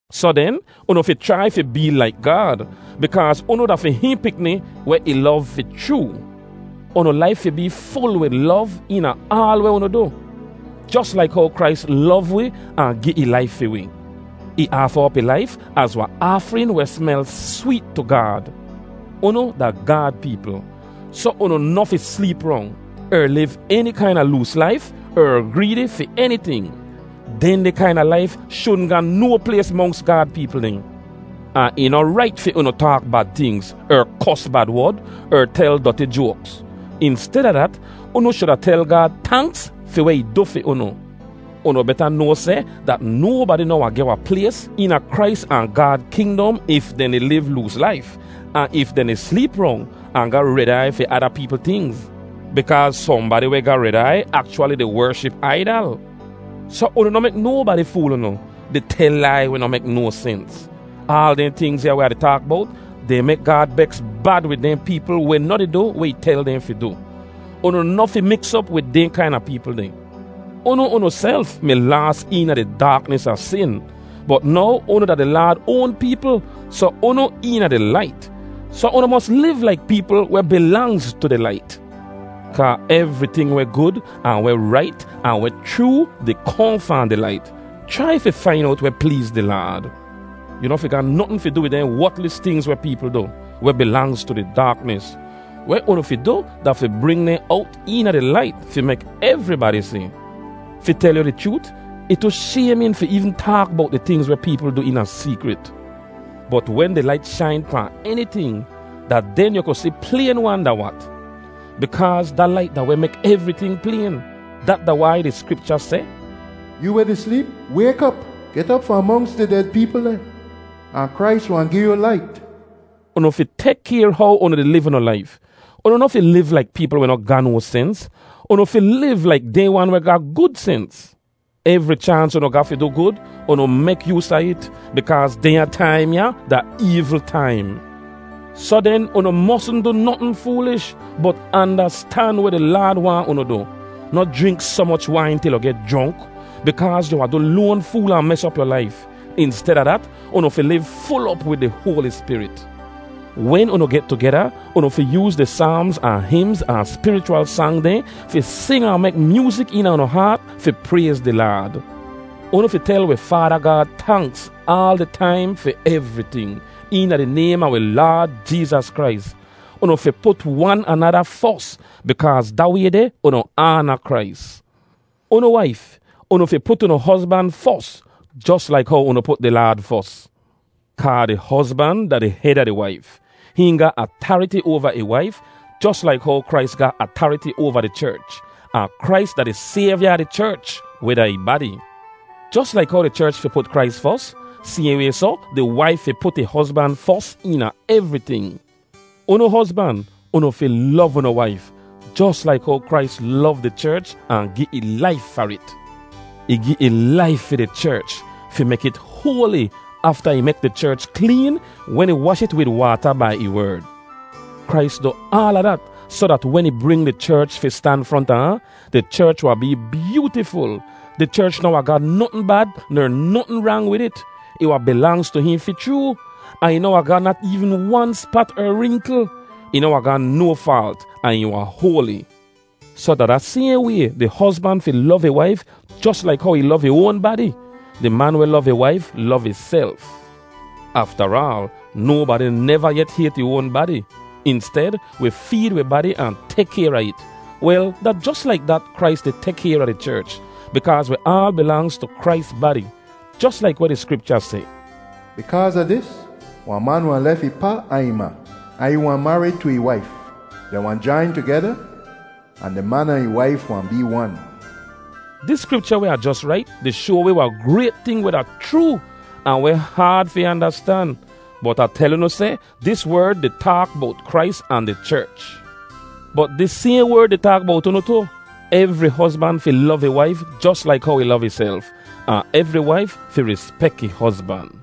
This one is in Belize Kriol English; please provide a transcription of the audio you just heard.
Soh den, unu fi chrai fi bee laik Gaad, bikaaz unu da fi hihn pikni weh ih lov fi chroo. Unu laif fi bee ful wid lov eena aal weh unu du, jos laik how Krais lov wi ahn gi ih laif fi wi. Ih aafa op ih laif az wahn aafrin weh smel sweet tu Gaad. Unu da Gaad peepl, soh unu noh fi sleep rong, er liv eni kaina loos laif, er greedi fi eniting. Dehndeh kaina laif shudn ga no plays monks Gaad peepl dehn. Ahn ih noh rait fi unu taak bad tingz, er kos bad wod, er tel doti joaks. Insteda dat, unu shuda tel Gaad tanks fi weh ih du fi unu. Unu beta noa seh dat nobadi noh wahn geh wahn plays eena Krais ahn Gaad kingdom if dehn di liv loos laif, ahn if dehn di sleep rong, ahn ga red aiy fi ada peepl tingz. Bikaaz sohnbadi weh ga red aiy akchwali di wership aidal. Soh unu noh mek nobadi fool unu, di tel lai weh noh mek no sens. Aal dehn tingz ya weh Ah di taak bowt, dehn mek Gaad beks bad wid dehn peepl weh noh di du weh ih tel dehn fi du. Unu noh fi miks op wid dehn kaina peepl deh. Unu unuself mi laas eena di daaknis a sin, bot now unu da di Laad oan peepl soh unu eena di lait. Soh unu mos liv laik peepl weh bilangz tu di lait. Kaa evriting weh gud ahn weh rait ahn weh chroo di kohn fahn di lait. Chrai fi fain owt weh pleez di Laad. Yu noh fi ga notn fi du wid dehn wotlis tingz weh peepl du, weh bilangz tu di daaknis. Weh unu fi du da fi bring dehn owt eena di lait fi mek evribadi si. Fi tel yu di chroot, ih tu shaymin fi eevn taak bowt di tingz weh peepl du eena seekrit. Bot wen di lait shain pahn eniting, da den yu ku si playn-wan da wat. Bikaaz da lait da weh mek evriting playn. Dat da wai di Skripcha seh, “Yoo weh di sleep, wayk op! Get op fahn monks di ded peepl dehn. Ahn Krais wahn gi yu lait.” Unu fi tek kayr how unu di liv unu laif. Unu noh fi liv laik peepl weh noh ga no sens. Unu fi liv laik dehn wan weh ga gud sens. Evri chaans unu ga fi du gud, unu mek yoos a it, bikaaz dehnya taim ya da eevl taim. Soh den, unu mosn du notn foolish, bot andastan weh di Laad waahn unu du. Noh jrink soh moch wain til yu geh jronk, bikaaz yu wahn du loan fool ahn mes op yu laif. Insteda dat, unu fi liv ful op wid di Hoali Spirit. Wen unu get tugeda, unu fi yooz di Saamz ahn himz ahn spirichwal sang dehn fi sing ahn mek myoozik eena unu haat fi prayz di Laad. Unu fi tel wi Faada Gaad tanks aal di taim fi evriting, eena di naym a wi Laad Jeezas Krais. Unu fi put wan anada fos, bikaaz da way deh unu aana Krais. Unu waif, unu fi put unu hozban fos, jos laik how unu put di Laad fos. Kaa di hozban da di hed a di waif. Hihn ga atariti oava ih waif jos laik how Krais ga atariti oava di cherch. Ahn Krais da di Sayvya a di cherch, weh da ih badi. Jos laik how di cherch fi put Krais fos, sayhn way soh di waif fi put ih hozban fos eena evriting. Unu hozban, unu fi lov unu waif, jos laik how Krais lov di cherch ahn gi ih laif far it. Ih gi ih laif fi di cherch fi mek it hoali afta ih mek di cherch kleen wen ih wash it wid waata bai ih werd. Krais du aala dat soh dat wen ih bring di cherch fi stan fronta ahn, di cherch wahn bee byootiful. Di cherch noh wahn ga notn bad ner notn rang wid it. Ih wahn bilangz tu hihn fi chroo, ahn ih noh wahn ga nat eevn wan spat er rinkl. Ih noh wahn ga no faalt ahn ih wahn hoali. Soh da da sayhn way, di hozban fi lov ih waif jos laik how ih lov ih oan badi. Di man weh lov ih waif lov ihself. Aftaraal, nobadi neva yet hayt ih oan badi. Insted, wi feed wi badi ahn tek kayr a it. Wel, da jos laik dat Krais di tek kayr a di cherch, bikaaz wi aal bilangz tu Krais badi. Jos laik weh di Skripcha seh, “Bikaaz a dis, wahn man wahn lef ih pa ahn ih ma, ahn ih wahn marid tu ih waif. Dehn wahn jain tugeda, ahn di man ahn ih waif wahn bee wan.” Dis Skripcha weh Ah jos rait di shoa wi wahn grayt ting weh da chroo, ahn weh haad fi andastan. Bot Ah tel unu seh dis werd di taak bowt Krais ahn di cherch. Bot dis sayhn werd di taak bowt unu tu. Evri hozban fi lov ih waif jos laik how ih lov ihself, ahn evri waif fi rispek ih hozban.